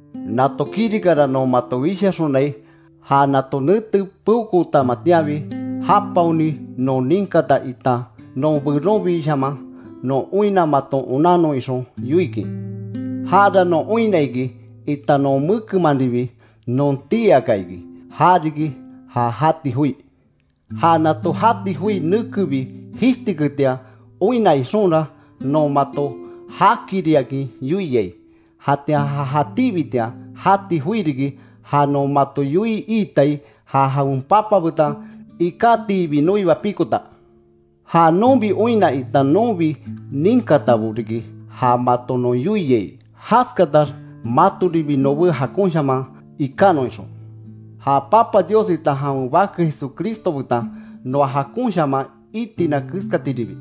Nato kirikara, non mato wishaxonai, ja nato nete peokootamatianbi japaoni non ninkata, itan non beronbishaman non oinna maton onannon ixon yoikin. Jara non oinna iki itan non mekemanribi non tii aka iki. Ja riki ja jati joi. Ja nato jati joi nekebi jishtiketian oinna ixonra, non mato jaakiriakin yoiai. Jatian ja jatíbitian jati joi riki, ja non mato yoii iitai, ja jawen Papa betan ikatiibi noiba pikota. Ja nonbi oinna, itan nonbi ninkatabo riki ja mato non yoiai, jaskatax matoribi nobé jakonshaman ikanon ixon. Ja Papa Dios itan jawen Bake Jesucristo betan, noa jakonshaman itina keskatiribi.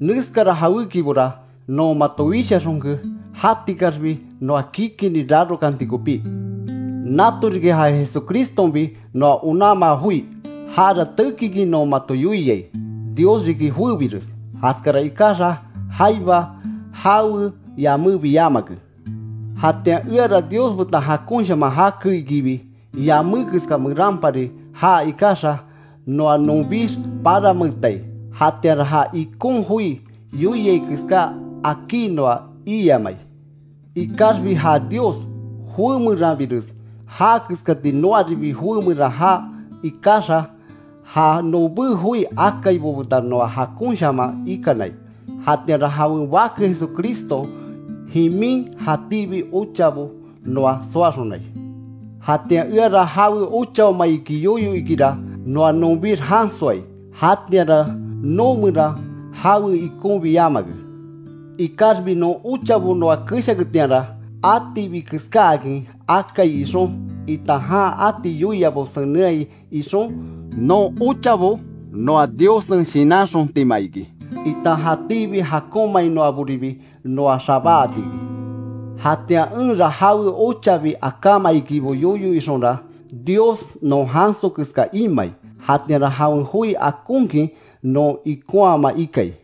Neskara jawékibora non mato wishaxonke, jatikaxbi noa kikinni rarokanti kopí. Nato riki ja Jesucristonbi noa onanmaa joi, jara tekikin non mato yoiai: Dios riki joébires, jaskara ikaxa, jaiba jawe yamébi yamake. Jatian eara Dios betan jakonshaman jake ikibi, yamé keska meranpari jaa ikaxa, noa nonbix paranmeetai. Jatianra ja ikon join yoiai keská akí noa iiyamai. Ikaxbi ja Dios, joé meranbires jaa keskati noaribi joé meran jaa ikaxa, ja nobé joi akaibo betan noa jakonshaman ikanai. Jatianra, jawen Bake Jesucriston jimin, jatíbi ochabo noa soaxonai. Jatian, eara jawe ochaoma iki yoyo ikira, noa nonbix jansoai, jatianra noo meran jawe ikonbi yamake. Ikaxbi non ochabo noa keshaketianra, atibi keskáakin akai ixon, itan jan ati yoiaibo senenhai ixon, non ochabo noa Diossen shinanxontima iki, itan jatíbi jakonmainoaribi noa xabáati iki. Jatian enra jawe ochabi akáma ikibo yoyo ixonra, Dios non janso keska imai. Jatianra jawen joi akonkin non ikonhaama ikai.